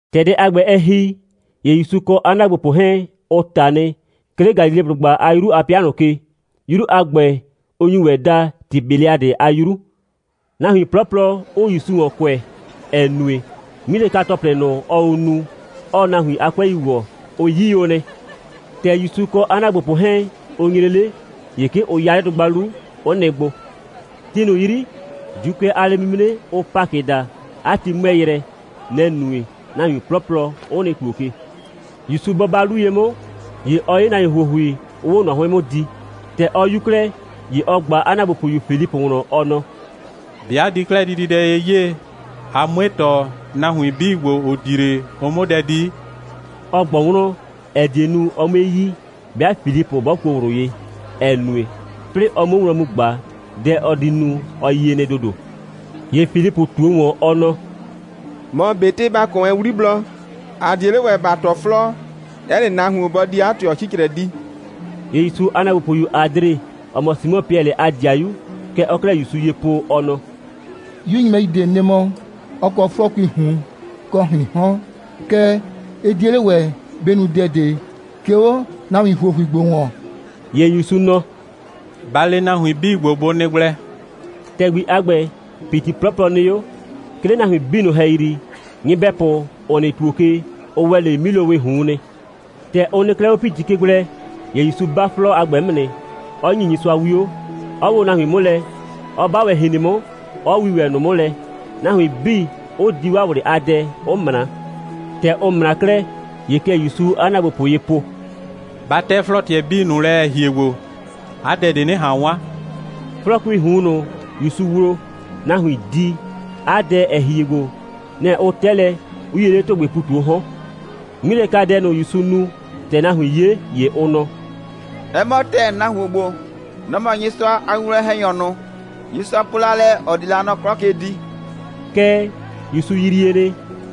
‑Tɛ dɛ a ‑gbɛ, ɛ ‑hi, ‑ye ‑Yusu kɔ 'a ‑naagbopʋ 'hɛɛn, ʋ ꞊ta nɩ, 'ke 'le Galileblʋgba a 'yru a 'pɩa ꞊nʋ ke. 'Yru a ‑gbɛ, ʋ nyu ‑wɛ daa Tibeliadɩ a 'yru; nahuin 'plɔplɔ 'ʋʋ ‑Yusu ‑wɔn kʋɛ, ‑ɛ nue, 'ŋmilɛka‑tɔplɩ ꞊nʋ, ɔɔ o nu, 'ɔɔ nahuin a 'kʋɛi ‑wɔ, ʋ 'yi o nɩ. ‑Tɛ ‑Yusu kɔ 'a ‑naagbopʋ 'hɛɛn, ʋ nyre 'le, ‑ye 'ke ʋ 'ya 'le dʋgba 'lu, 'ʋ nɩ gbo. Ti ꞊nʋ 'yri, ‑Juukʋɛ a lɛ'mimre, ʋʋ Pakɩ daa, 'a ti 'mʋɛɛ yrɛ. Nɛ‑ nue, nahuin 'plɔplɔ 'ʋ nɩ ‑tuo ke. ‑Yusu bɔ 'ba 'lu ye 'mʋ, ‑ye ɔ 'ye nahuin ‑huohui, 'ʋʋ 'o ꞊nɔ 'hʋɩn 'mʋ di. ‑Tɛ ɔ 'yu 'klɛɛ, ‑ye ɔ ꞊gba 'a ‑naagbopʋyu Filipʋ wlɔn, ɔ nɔ: «‑Be' ‑a di 'klɛɛ dididɛ ye 'yee, ‑a 'mue ‑tɔ, nahuin 'bii ‑gbo, ‑ʋ di 'le, ʋ 'mʋ dɛ di?» Ɔ ꞊gbɔ wlɔn, ‑ɛ die nu, ɔ 'mue yi, 'bɩa Filipʋ 'bɔ kuo ꞊wlʋ ye, ‑ɛ nue, 'plɩɩ ɔ 'muo wlɔn mu ꞊gba, dɛ ɔ di nu, ɔ yie nɩ ‑dodo. ‑Ye Filipʋ ꞊tuo ‑wɔn, ɔ nɔ: «Mɔ ꞊betɩ ‑ba kɔ wɛn 'wliblɔ, ‑a 'die 'le ‑wɛ ‑ba ‑tɔ 'flɔɔ, 'ɛ nɩ nahuon bɔ di 'a ꞊tɩɔ 'cicrɛ di.» ‑Ye ‑Yusu a ‑naagbopʋyu Adre, ‑ɔ mɔ Simɔ Piɛlɩ a ‑dɩayu, kɛ ɔɔ 'klɛɛ ‑Yusu ye po, ɔ nɔ: «'Yu nyɩbɛyu ꞊de nɩ mɔ, 'ɔ kɔ 'flɔɔkuii ꞊hun kɔ ‑hriin 'hɔn. Kɛɛ, ɩ 'die 'le ‑wɛ bɩ nu dɛ ꞊de, 'ke 'o nahuin ‑huohui ‑gbo ‑wɔn.» ‑Ye ‑Yusu nɔ: «Ba le nahuin 'bii ‑gbo, bʋ nɩ gblɛ.» ‑Tɛgbi a ‑gbɛ, ‑piti 'plɔplɔ nɩ 'o. 'Ke 'le nahuin 'bii ꞊nʋ ‑hɛyri, nyɩbɛpʋ, ‑ʋ nɩ ‑tuo ke, ʋ ‑wɛ 'le 'milowɩɩ ꞊hun nɩ. ‑Tɛ ʋ nɩ 'klɛɛ 'o ‑piti ke gblɛ, ‑ye ‑Yusu 'ba 'flɔɔ a ‑gbɛ 'mʋ nɩ, 'ɔ ‑nyi Nyɩsʋa 'wio, 'ɔ woo nahuin 'mʋ lɛ, 'ɔ 'ba ‑wɛ ‑hrin 'mʋ, 'ɔ wii ‑wɛ ꞊nʋ 'mʋ lɛ, nahuin 'bii, 'ʋ di 'waa ꞊wlɩ a dɛ, 'ʋ ꞊mra. ‑Tɛ ʋ ꞊mra 'klɛɛ, ‑ye kɛ ‑Yusuu 'a ‑naagbopʋ ye po: «Ba 'tɛ 'flɔɔ꞊tɩɛ 'bii ꞊nʋ lɛ, ‑ɛ hie gbo, 'a dɛ ꞊de 'nɩ ꞊han 'wan.» 'Flɔɔkuii ꞊hun ꞊nʋ, ‑Yusu wloo, nahuin di, 'a dɛ, ‑ɛ hie gbo, nɛ‑ ʋ 'tɛ lɛ, 'ʋ 'yie 'le ‑tʋgbɩɩ ‑pu ꞊tu 'o 'hɔn. 'Ŋmilɛkadɛ ꞊nʋ, ‑Yusu nu, ‑tɛ nahuin 'ye, ‑ye ʋ nɔ: «'Ɛ mɔ ‑tɛɛ, nahuon ‑gbo, nɔ‑ mɔ Nyɩsʋa a winwlɔn‑hɛnyɔ ꞊nʋ, Nyɩsʋa po la lɛ, ‑ɔ di la nɔ 'klɔ ke di.» Kɛɛ, ‑Yusu yrie nɩ,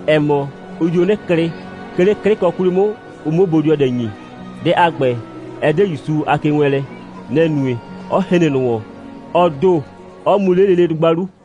‑ɛ mɔ, ʋ dio 'nɩ klɩ, 'ke 'le 'klɩkɔ 'kwli 'mʋ, ɔ 'muo bodɩɔdɛ ‑nyi. Dɛ a ‑gbɛ, ɛ 'de ‑Yusu a kewɛɛnlɛ. Nɛ‑ nue, 'ɔ hren ꞊nʋ ‑wɔn, ɔ ‑do, 'ɔ mu 'le lele dʋgba 'lu.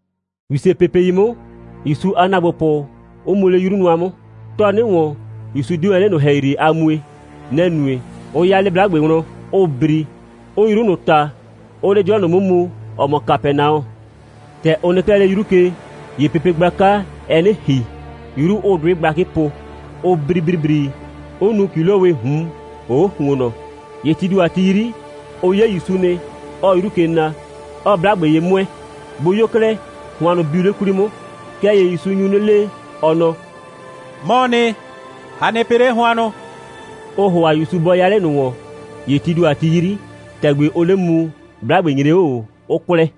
‑Wisepepei 'mʋ, ‑Yusu a ‑naagbopʋ 'ʋ mu 'le 'yru nʋa 'mʋ. 'Tɔɔ 'nɩ ‑wɔn, ‑Yusu 'de wɛn 'le ꞊nʋ ‑hɛyri a mue. Nɛ‑ nue, 'ʋ 'ya 'le 'blagbe wlɔn, 'ʋʋ bri, 'ʋʋ 'yru ꞊nʋ ꞊ta, 'ʋʋ 'le 'dɩɔ ꞊nʋ 'mʋ mu, ‑ɔ mɔ Kapɛnaɔ. ‑Tɛ ʋ nɩ 'klɛɛ 'le 'yru ke, ‑ye pepe gblaka, ɛɛ 'nɩ ‑hi, 'yru 'ʋʋ 'dʋɩ gblakɩ po, 'ʋ bri ‑bribri, 'ʋ nu ‑kilowɩɩ ꞊hun ‑hoo' ‑huonnɔ. ‑Ye tii ‑do a ti 'yri, ʋ 'ye ‑Yusu nɩ, 'ɔɔ 'yru ke na, 'ɔɔ 'blagbe ye 'mʋɛɛ. Bʋ 'yo 'klɛɛ, hʋannʋ biu 'le 'kwli 'mʋ. Kɛɛ ‑ye ‑Yusu nyu 'nɩ le, ɔ nɔ: «'Mɔɔ nɩ, a nɩ pɩ 'le hʋannʋ!» Ʋʋ ‑hʋa ‑Yusu bɔ 'ya 'le ꞊nʋ ‑wɔn. ‑Ye tii ‑do a ti 'yri, ‑tɛgbi ʋʋ 'le mu, 'blagbe nyre 'o ꞊o, 'ʋ kwlɛ.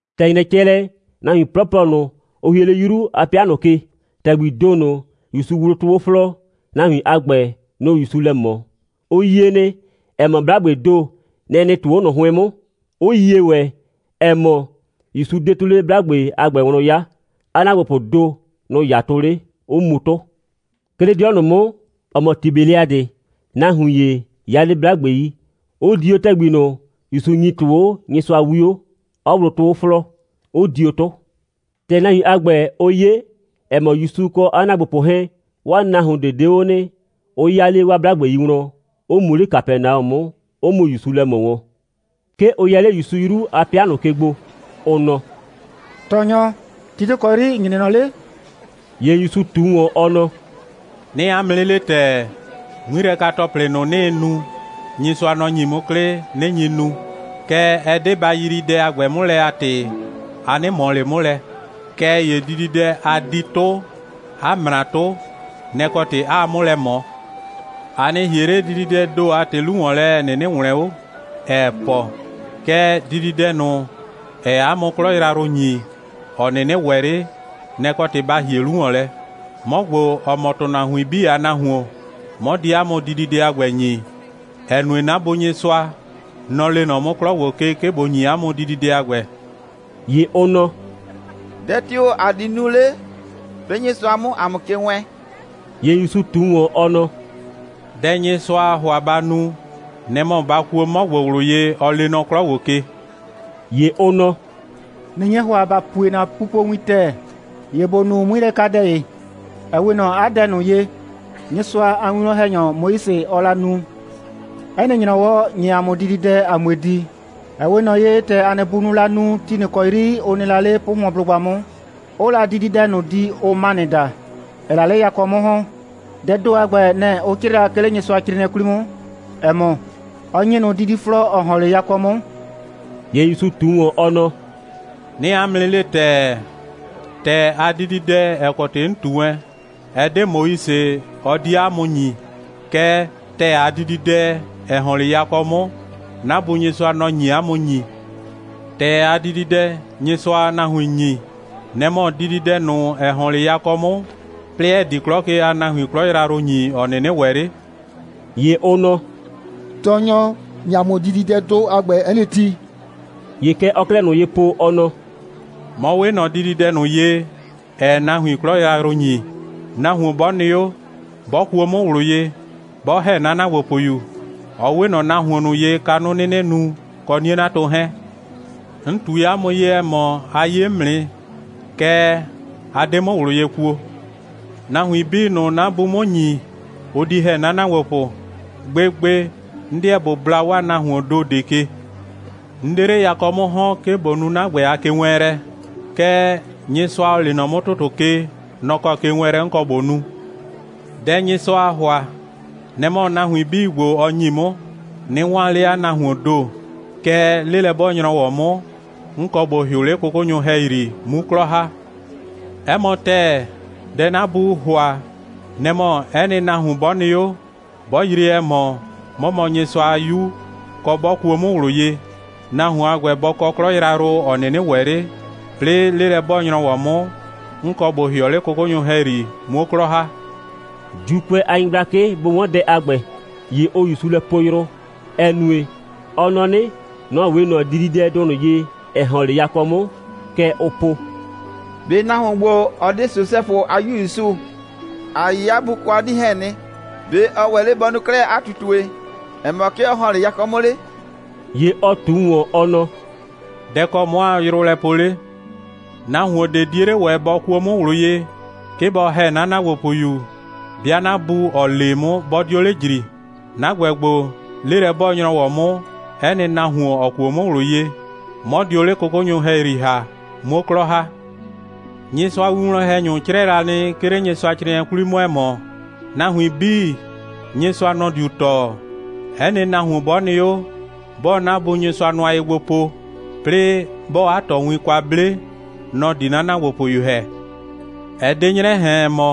‑Tɛ ‑nyrɛ cɛ lɛ, nahuin 'plɔplɔ ꞊nʋ, ‑ʋ hie 'le 'yru a 'pɩa ꞊nʋ ke, ‑tɛgbii ‑do ꞊nʋ, ‑Yusu wloo 'tʋ 'o 'flɔɔ, nahuin a ‑gbɛ, nʋ‑ʋ ‑Yusu lɛ ꞊mɔ. Ʋ yie nɩ, ‑ɛ mɔ, 'blagbee ‑do, nɛ‑ nɩ 'tʋ 'o 'nʋhʋɔn 'mʋ, 'ʋ yie ‑wɛ, ‑ɛ mɔ, ‑Yusu 'de 'tʋ 'le 'blagbe a ‑gbɛ wlɔn 'ya. 'A ‑naagbopʋʋ ‑do, nʋ‑ 'ya 'tʋ 'le, 'ʋ mu 'tʋ. 'Ke 'le 'dɩɔ ꞊nʋ 'mʋ, ‑ɔ mɔ Tibeliadɩ, nahuin ‑ye ya 'le 'blagbei, 'ʋ di 'o ‑tɛgbi ꞊nʋ, ‑Yusu ‑nyii 'tʋ 'o Nyɩsʋa 'wio, 'ɔ wloo 'tʋ 'o 'flɔɔ, 'ʋ dio 'tʋ. ‑Tɛ nahuin a ‑gbɛ, ʋ 'ye, ‑ɛ mɔ, ‑Yusu kɔ 'a ‑naagbopʋ 'hɛɛn, 'waa nahuon ꞊de 'de 'o nɩ, ʋ 'ya 'le 'waa 'blagbei wlɔn, 'ʋ mu 'le Kapɛnaɔ 'mʋ, 'ʋ mu ‑Yusu lɛ ꞊mɔ wɔn. 'Ke ʋ yɛ 'le ‑Yusu 'yru a 'pɩa ꞊nʋ ke gbo, ʋ nɔ: «Tɔɔnyɔ, ti tio‑ kɔ 'yri ‑n nyre nɔ 'le?» ‑Ye ‑Yusu ꞊tu ‑wɔn, ɔ nɔ: «'Nɩɩ 'a mʋ 'nɩ le ‑tɛɛ: 'Ŋmilɛka‑tɔplɩ ꞊nʋ, 'nɩɩ nu, Nyɩsʋa, nɔ‑ ‑nyi 'mʋ 'klɩ, 'nɩ nyi nu. Kɛɛ, ɛ 'de ba yrii dɛ a ‑gbɛ 'mʋ lɛ a ‑tɩ, a 'nɩ ꞊mɔ ꞊le 'mʋ lɛ. Kɛɛ ‑ye dididɛ, a di 'tʋ, 'a ꞊mra 'tʋ, nɛ‑ kɔ ‑tɩ 'aa 'mʋ lɛ ꞊mɔ. A nɩ ‑hie 'le dididɛɛ ‑do a ‑tɩ 'lu ‑wɔn lɛ, ‑ɛ 'nɩnɩ ‑wlɛn 'o, ‑ɛɛ pɔ, kɛɛ, dididɛ ꞊nʋ, ‑ɛɛ 'a mʋ 'klɔ yrayrʋ ‑nyi, ‑ɔ 'nɩnɩ ‑wɛ 'le, nɛ‑ kɔ ‑tɩ ba ‑hie 'lu ‑wɔn lɛ. 'Mɔ ‑gbo, ‑ɔ mɔ ‑tʋnahuin 'bii a Nahuon, 'mɔ di 'a mʋ dididɛ a ‑gbɛ ‑nyi, ‑ɛ nue, 'na Bu Nyɩsʋa, nɔ‑ lee nɔ 'mʋ 'klɔ ‑gbo ke, 'ke ꞊bo ‑nyi 'a mʋ dididɛ a ‑gbɛ.» ‑Ye ʋ nɔ: «Dɛ tio‑ ‑a di nu 'le, 'plɩɩ Nyɩsʋa 'mʋ ‑a mʋ ke wɛɛn?» ‑Ye ‑Yusu ꞊tu ‑wɔn, ɔ nɔ: «Dɛ Nyɩsʋaa ‑hʋa ba nu, nɛ‑ mɔ ba kuo 'mɔ ‑gbo ꞊wlʋ ye, ɔ lee nɔ 'klɔ ‑gbo ke.» ‑Ye ʋ nɔ: «꞊Nɩ nye ‑hʋa, ‑ba pue ‑na pupowin ‑tɛɛ, ‑ye ‑bo nu 'ŋmilɛkadɛ ‑ye, ‑ɛ 'we ꞊nɔ 'a dɛ ꞊nʋ ye, Nyɩsʋa a winwlɔn‑hɛnyɔ Moise, ɔɔ la nu. 'Ɛ nɩ ‑nyrɔwɔ, ‑nyi ‑a mʋ dididɛ, ‑a 'mue di, ‑ɛ 'we ꞊nɔ ye, ‑tɛ ‑a nɩ bunʋʋ la nu, ti ꞊nʋ ‑kɔ 'yri ʋ nɩ la 'le 'pʋhʋɔnblʋgba 'mʋ, 'ʋʋ la dididɛ ꞊nʋ di, ʋʋ manɩ daa, ‑ɛɛ la 'le yakɔ 'mʋ ‑hɔn. Dɛɛ ‑do a ‑gbɛ, nɛ‑ ʋ 'crɩɩ la, 'ke 'le Nyɩsʋacrɩɩnɩɛ 'kwli 'mʋ, ‑ɛ mɔ: Ɔ ‑nyi ꞊nʋ didiflɔɔ, ‑ɔ ‑hɔn 'le yakɔ 'mʋ.» ‑Ye ‑Yusu ꞊tu ‑wɔn, ɔ nɔ: «'Nɩɩ 'a mʋ 'nɩ le ‑tɛɛ, ‑tɛɛ a dididɛ, ‑ɛ kɔ ‑tɩ 'n ꞊tu wɛn, ɛ 'de Moise, ɔ 'die 'a mʋ ‑nyi. Kɛɛ, ‑tɛɛ a dididɛ, ‑ɛ ‑hɔn 'le yakɔ 'mʋ, 'na Bu Nyɩsʋa, nɔ‑ nye 'a mʋ ‑nyi. ‑Tɛɛ a dididɛ, Nyɩsʋaa nahuin ‑nyi, nɛ‑ mɔ dididɛdʋ ꞊nʋ, ‑ɛ ‑hɔn 'le yakɔ 'mʋ, 'plɩɩ ‑ɛ di 'klɔ ke a nahuin 'klɔ yrayrʋ ‑nyi, ‑ɔ 'nɩnɩ ‑wɛ 'le.» ‑Ye ʋ nɔ: «Tɔɔnyɔ, ‑nyi ‑a mʋ dididɛdʋ a ‑gbɛ 'ɛ nɩ ti!» ‑Ye kɛ ɔɔ 'klɛɛ ꞊nʋ ye po, ɔ nɔ: «'Mɔ 'we ꞊nɔ dididɛdʋ ꞊nʋ ye, ‑ɛɛ nahuin 'klɔ yrayrʋ ‑nyi. Nahuon 'bɔ nɩ 'o, 'bɔ kuo 'mʋ ꞊wlʋ ye, 'bɔ ‑hɛ 'na ‑naagbopʋyu, ɔ 'we ꞊nɔ nahuon ꞊nʋ ye, kanʋ 'nɩnɩ nu, kɔ 'nie'natʋ 'hɛɛn. 'N ꞊tui 'a mʋ ye, ‑ɛ mɔ, a 'ye 'mʋ nɩ, kɛɛ, a 'de 'mʋ ꞊wlʋ ye kuo. Nahuin 'bii ꞊nʋ, 'na Buu 'mʋ ‑nyi, ʋ di ‑hɛ 'na ‑naagbopʋ. Gbegbe, 'n 'deɛ ꞊bo bla 'waa nahuoon ‑do ꞊de ke. 'N 'de 'le yakɔ 'mʋ ‑hɔn, 'ke ꞊bo nu 'na ‑gbɛ a kewɛɛnlɛ, kɛɛ, Nyɩsʋa, ‑ɔ lee nɔ 'mʋ ‑tʋtʋ ke, nɔ‑ kɔ kewɛɛnlɛ 'n kɔ ꞊bo nu. Dɛ Nyɩsʋaa ‑hʋa, nɛ‑ mɔ, nahuin 'bii ‑gbo, ɔ ‑nyi 'mʋ, 'nɩ 'waan 'le 'a nahuoon ‑do, kɛɛ, 'lelɛ'bɔɔ‑nyrɔwɔ 'mʋ, 'n kɔ ꞊bo ‑hɩʋ 'le 'kʋkʋnyʋ ‑hɛyri, 'mu 'klɔ ‑ha. 'Ɛ mɔ ‑tɛɛ, dɛ 'na Buu ‑hʋa, nɛ‑ mɔ, 'ɛ nɩ nahuon 'bɔ nɩ 'o, 'bɔ yrie, ‑ɛ mɔ, 'mɔ mɔ Nyɩsʋa a 'Yu, kɔ, 'bɔ kuo 'mʋ ꞊wlʋ ye, nahuon a ‑gbɛ bɔ kɔ 'klɔ yrayrʋ, ‑ɔ 'nɩnɩ ‑wɛ 'le, 'plɩɩ 'lelɛ'bɔɔ‑nyrɔwɔ 'mʋ, 'n kɔ ꞊bo ‑hɩɔ 'le 'kʋkʋnyʋ ‑hɛyri, 'muo 'klɔ ‑ha.» ‑Juukʋɛ a nyɩgblakɩ bʋ 'wɔn dɛ a ‑gbɛ, ‑ye ʋʋ ‑Yusu lɛ poo yrʋ, ‑ɛ nue, ɔ nɔ 'nɩ, nɔ‑ 'we ꞊nɔ dididɛdʋ ꞊nʋ ye, ‑ɛ ‑hɔn 'le yakɔ 'mʋ. Kɛ ʋʋ po: «꞊Be nahuon ‑gbo, ɔ 'de Sosɛfʋ a 'yu ‑Yusu? ‑A yi 'a bu kɔ 'a 'dii 'hɛɛn nɩ. ‑Be' ɔ ‑wɛ 'le bɔ nu 'klɛɛ 'a ꞊tutue, ‑ɛ mɔ, 'ke ɔ ‑hɔn 'le yakɔ 'mʋ 'le?» ‑Ye ɔ ꞊tu ‑wɔn, ɔ nɔ: «Dɛ‑ kɔ 'mɔ aa yrʋ lɛ poo 'le? Nahuon ꞊de 'die 'le ‑wɛ bɔ kuo 'mʋ ꞊wlʋ ye, 'ke bɔ ‑hɛ 'na ‑naagbopʋyu, 'bɩa 'na Bu, ‑ɔ lee 'mʋ, 'bɔ 'dio 'le ‑jri. 'Na ‑gbɛ ‑gbo, 'lelɛ'bɔɔ‑nyrɔwɔ 'mʋ, 'ɛ nɩ nahuon, ‑ɔ kuo 'mʋ ꞊wlʋ ye, 'mɔ dio 'le 'kʋkʋnyɔ ‑hɛyri ‑ha, 'muo 'klɔ ‑ha. Nyɩsʋa a winwlɔn‑hɛnyʋ 'crɛɛ la nɩ, 'ke 'le Nyɩsʋacrɩɩnɩɛ 'kwli 'mʋ, ‑ɛ mɔ: Nahuin 'bii, Nyɩsʋa, nɔ‑ diu tɔɔ. 'Ɛ nɩ nahuon 'bɔ nɩ 'o, 'bɔɔ 'na Bu Nyɩsʋa nʋa ye gbo po, 'plɩɩ 'bɔɔ 'a tɔɔwin kwa 'ble, nɔ‑ di 'na ‑naagbopʋyu ‑hɛ. Ɛ 'de 'nyrɛ ꞊hɛn, ‑ɛ mɔ,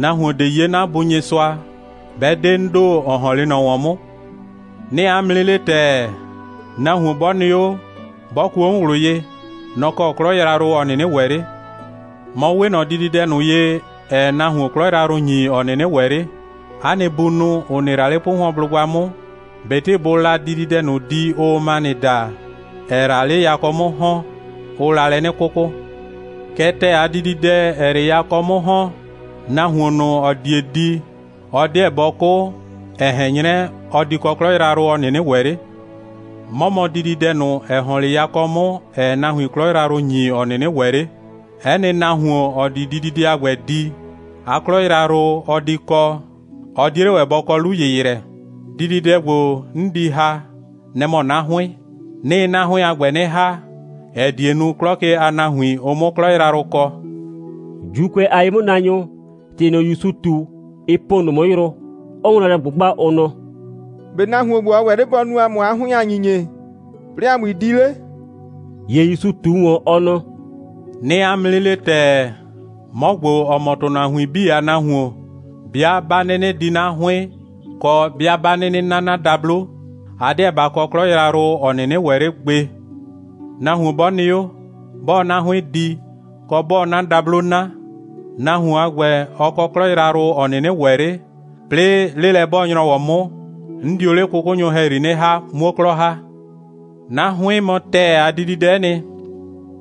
nahuon ꞊de 'ye 'na Bu Nyɩsʋa, 'bɛ 'de 'n ‑do, ‑ɔ ‑hɔn 'le ꞊nɔ ‑wɔn 'mʋ. 'Nɩɩ 'a mʋ 'nɩ le ‑tɛɛ, nahuon 'bɔ nɩ 'o, 'bɔ kuo 'mʋ ꞊wlʋ ye, nɔ‑ kɔ 'klɔ yrayrʋ, ‑ɔ 'nɩnɩ ‑wɛ 'le. 'Mɔ 'we ꞊nɔ dididɛdʋ ꞊nʋ ye, ‑ɛɛ nahuon 'klɔ yrayrʋ ‑nyi, ‑ɔ 'nɩnɩ ‑wɛ 'le. 'A nɩ bunʋ, ‑ʋ nɩ la 'le 'pʋhʋɔnblʋgba 'mʋ, ꞊betɩ bʋʋ la dididɛdʋ ꞊nʋ di, ʋʋ manɩ daa, ‑ɛɛ la 'le yakɔ 'mʋ ‑hɔn, ʋʋ la lɛ 'nɩ 'kʋkʋ. Kɛɛ, ‑tɛɛ a dididɛ, ‑ɛɛ 'le yakɔ 'mʋ ‑hɔn, nahuon ꞊nʋ, ‑ɔ die di, ɔ 'deɛ bɔ 'kʋ, ‑ɛ ꞊hɛn 'nyrɛ, ɔ di kɔ 'klɔ yrayrʋ, ‑ɔ 'nɩnɩ ‑wɛ 'le. 'Mɔ mɔ dididɛdʋ ꞊nʋ, ‑ɛ ‑hɔn 'le yakɔ 'mʋ, ‑ɛɛ nahuin 'klɔ yrayrʋ ‑nyi, ‑ɔ 'nɩnɩ ‑wɛ 'le. 'Ɛ nɩ nahuon, ‑ɔ di dididɛ a ‑gbɛ di, 'a 'klɔ yrayrʋ, ɔ di kɔ, ɔ 'die 'le ‑wɛ bɔ kɔ 'lu‑yɩyrɛ. Dididɛ ‑gbo, 'n di ‑ha, nɛ‑ mɔ 'na 'hʋɩn. 'Nɩɩ 'na 'hʋɩn a ‑gbɛ 'nɩ ‑ha, ‑ɛ die nu, 'klɔ ke a nahuin, ʋ 'mʋ 'klɔ yrayrʋ kɔ.» ‑Juukʋɛ a ye'mʋnaanyʋ, ‑tɩ ꞊nʋ, ‑Yusu ꞊tu, ɩ po ꞊nʋ 'mʋ yrʋ, 'ʋʋ wlɔn lɛ ꞊gbʋgba, ʋ nɔ: «‑Be' nahuon ‑gbo, ɔ ‑wɛ 'le bɔ nu ‑a mʋ 'a 'hʋɩn a ‑nyinyie, 'plɩɩ ‑a 'mui di 'le?» ‑Ye ‑Yusu ꞊tu ‑wɔn, ɔ nɔ: «'Nɩɩ 'a mʋ 'nɩ le ‑tɛɛ, 'mɔ ‑gbo, ‑ɔ mɔ ‑tʋnahuin 'bii a Nahuon, 'bɩa 'ba 'nɩnɩ di 'na 'hʋɩn, kɔ, 'bɩa 'ba 'nɩnɩ 'na 'na dablo, a 'deɛ ba kɔ 'klɔ yrayrʋ, ‑ɔ 'nɩnɩ ‑wɛ 'le gbe. Nahuon 'bɔ nɩ 'o, 'bɔɔ 'na 'hʋɩn di, kɔ, 'bɔɔ 'na dablo 'na, nahuon a ‑gbɛ, ɔ kɔ 'klɔ yrayrʋ, ‑ɔ 'nɩnɩ ‑wɛ 'le, 'plɩɩ 'lelɛ'bɔɔ‑nyrɔwɔ 'mʋ, 'n dio 'le 'kʋkʋnyʋ ‑hɛyri 'nɩ ‑ha, 'muo 'klɔ ‑ha. 'Na 'hʋɩn mɔ ‑tɛɛ a dididɛ'ɛ nɩ,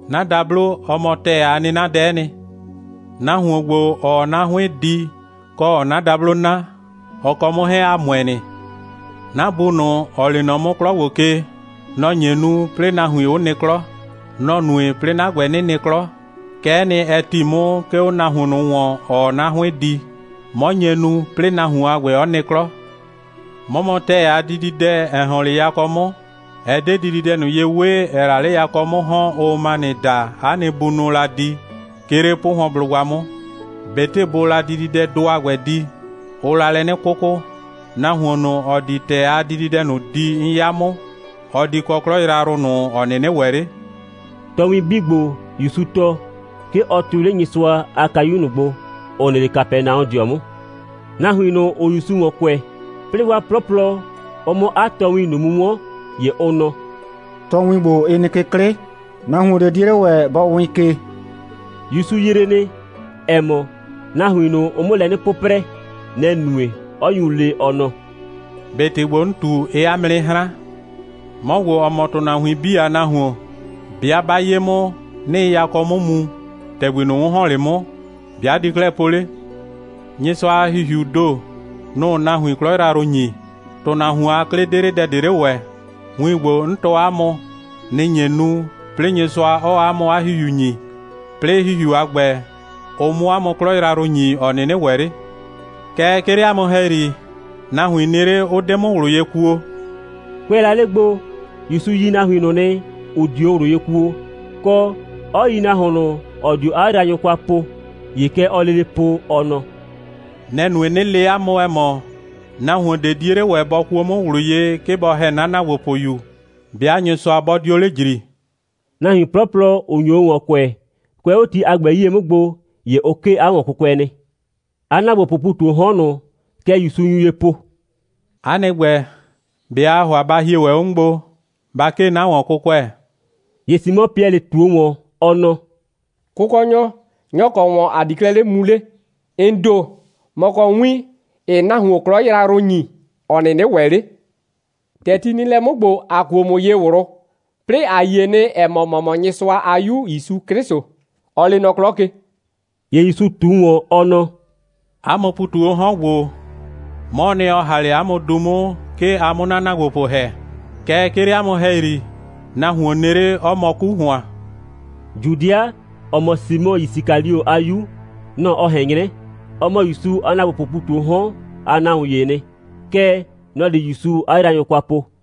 'na dablo, ɔ mɔ ‑tɛɛ a 'nɩnadɛ'ɛ nɩ. Nahuon ‑gbo, ‑ɔɔ 'na 'hʋɩn di, kɔ, ‑ɔɔ 'na dablo 'na, ɔ kɔ 'mʋ 'hɛɛn, ‑a ‑mʋɛ nɩ. 'Na Bu ꞊nʋ, ‑ɔ lee nɔ 'mʋ 'klɔ ‑gbo ke, nɔ‑ nye nu, 'plɩɩ nahuin 'ʋ nɩ 'klɔ. Nɔ‑ nue, 'plɩɩ 'na ‑gbɛ, 'nɩ nɩ 'klɔ. Kɛ'ɛ nɩ, ɛ ‑ti 'mʋ, 'ke 'o nahuon ꞊nʋ ‑wɔn, ‑ɔɔ 'na 'hʋɩn di. 'Mɔ nye nu, 'plɩɩ nahuon a ‑gbɛ 'ɔ nɩ 'klɔ. 'Mɔ mɔ ‑tɛɛ a dididɛ, ‑ɛ ‑hɔn 'le yakɔ 'mʋ. Ɛ 'de dididɛ ꞊nʋ ye 'we, ‑ɛɛ la 'le yakɔ 'mʋ ‑hɔn, ʋʋ manɩ daa, 'a nɩ bunʋʋ la di, 'ke 'le 'pʋhʋɔnblʋgba 'mʋ. ꞊Betɩ bʋʋ la dididɛdʋ a ‑gbɛ di, ʋʋ la lɛ 'nɩ 'kʋkʋ. Nahuon ꞊nʋ, ‑ɔ di ‑tɛɛ a dididɛ ꞊nʋ di, 'n 'ya 'mʋ, ɔ di kɔ 'klɔ yrayrʋ ꞊nʋ, ‑ɔ 'nɩnɩ ‑wɛ 'le.» Tɔɔwin 'bii ‑gbo, ‑Yusu tɔɔ, 'ke ɔ tʋɩ 'le Nyɩsʋa a kayu ꞊nʋ gbo, ‑ʋ nɩ 'le Kapɛnaɔdɩɔ 'mʋ. Nahuin ꞊nʋ, ‑ʋʋ ‑Yusu ‑wɔn kʋɛ, 'plɩɩ 'waa 'plɔplɔ, ʋ 'mʋ 'a tɔɔwin ꞊nʋ mu 'wɔn, ‑ye ʋ nɔ: «Tɔɔwin ‑gbo, ɩ nɩ ke 'klɩ. Nahuon ꞊de 'die 'le ‑wɛ bɔ wɩɩn ke.» ‑Yusu yree nɩ, ‑ɛ mɔ, nahuin ꞊nʋ, ʋʋ 'mʋ lɛ 'nɩ 'pʋprɛ. Nɛ‑ nue, 'ɔ nyu le, ɔ nɔ: «꞊Be ‑tɩ ‑gbo, 'n ꞊tu, ɩɩ 'a mʋ 'nɩ 'hran? 'Mɔ ‑gbo, ‑ɔ mɔ ‑tʋnahuin 'bii a Nahuon, 'bɩa 'ba 'ye 'mʋ, 'nɩɩ yakɔ 'mʋ mu, ‑tɛgbi ꞊nʋ, 'n ‑hɔn 'le 'mʋ, ‑be' a di 'klɛɛ po 'le? Nyɩsʋa a ‑Hihiuu ‑do, nʋ‑ʋ nahuin 'klɔ yrayrʋ ‑nyi. ‑Tʋnahuon a 'klɩ 'de 'le dɛ ꞊de 'le ‑wɛ. Win ‑gbo, 'n tɔɔ 'a mʋ, nɩ‑ nye nu, 'plɩɩ Nyɩsʋa 'ɔɔ 'a mʋ 'a ‑Hihiu ‑nyi, 'plɩɩ ‑Hihiu a ‑gbɛ, ʋ 'mʋ 'a mʋ 'klɔ yrayrʋ ‑nyi, ‑ɔ 'nɩnɩ ‑wɛ 'le. Kɛɛ, 'ke 'le 'a mʋ ‑hɛyri, nahuin nɩ 'le, 'ʋ 'de 'mʋ ꞊wlʋ ye kuo.» Kʋɛ la 'le gbo, ‑Yusu yi nahuin ꞊nʋ nɩ, ‑ʋ 'dio ꞊wlʋ ye kuo, kɔ, 'ɔ yi nahuon ꞊nʋ, ‑ɔ dio 'a yraanyʋ kwa po. ‑Ye kɛ ɔɔ lele po, ɔ nɔ: «Nɛ‑ nue, 'nɩ le 'a mʋ, ‑ɛ mɔ, nahuon ꞊de 'die 'le ‑wɛ bɔ kuo 'mʋ ꞊wlʋ ye, 'ke bɔ ‑hɛ 'na ‑naagbopʋyu, 'bɩa Nyɩsʋa 'bɔ 'dio 'le ‑jri.» Nahuin 'plɔplɔ, ‑ʋ nyo o ‑wɔn kʋɛ, kʋɛ 'o ti a ‑gbɛ 'yie 'mʋ gbo, ‑ye ʋ 'kee 'a ‑wɔnkʋkʋɛ nɩ. 'A ‑naagbopʋʋ ‑pu ꞊tu 'o 'hɔn ꞊nʋ, kɛ ‑Yusu nyu ye po: «'A nɩ ‑gbɛ, ꞊be aa ‑hʋa ba hie ‑wɛ 'o 'mʋ gbo, ba 'kee 'na ‑wɔnkʋkʋɛ?» ‑Ye Simɔ Piɛlɩ ꞊tuo ‑wɔn, ɔ nɔ: «Kʋkɔnyɔ, nyɔ‑ kɔ ‑wɔn ‑a di 'klɛɛ 'le mu 'le? ‑N ‑do, ‑mɔ kɔ win, ‑ɩɩ nahuon 'klɔ yrayrʋ ‑nyi, ‑ɔ 'nɩnɩ ‑wɛ 'le. ‑Tɛ ti nɩ lɛ 'mʋ ‑gbo, ‑a kuo ‑mʋ ye ꞊wlʋ, 'plɩɩ ‑a yie nɩ, ‑ɛ mɔ, ‑mɔ mɔ Nyɩsʋa a 'Yu ‑Yusu 'Klɩsʋ, ɔ lee nɔ 'klɔ ke.» ‑Ye ‑Yusu ꞊tu ‑wɔn, ɔ nɔ: «'A mʋ ‑pu ꞊tu 'o 'hɔn ‑gbo, 'mɔɔ nɩ, ‑ɔ ‑ha 'le 'a mʋ du 'mʋ, 'ke a 'mʋ 'na ‑naagbopʋ ‑hɛ. Kɛɛ, 'ke 'le 'a mʋ ‑hɛyri, nahuon nɩ 'le, 'ɔ mɔ 'ku ‑hʋan.» Judɩa, ‑ɔ mɔ Simɔ Yisikalio a 'yu, nɔ‑ ɔ ꞊hɛn 'nyrɛ. Ɔ mɔ ‑Yusu a ‑naagbopʋʋ ‑pu ꞊tu 'o 'hɔn a nahuon ‑yee nɩ. Kɛɛ, nɔ‑ di ‑Yusu 'a yraanyʋ kwa po.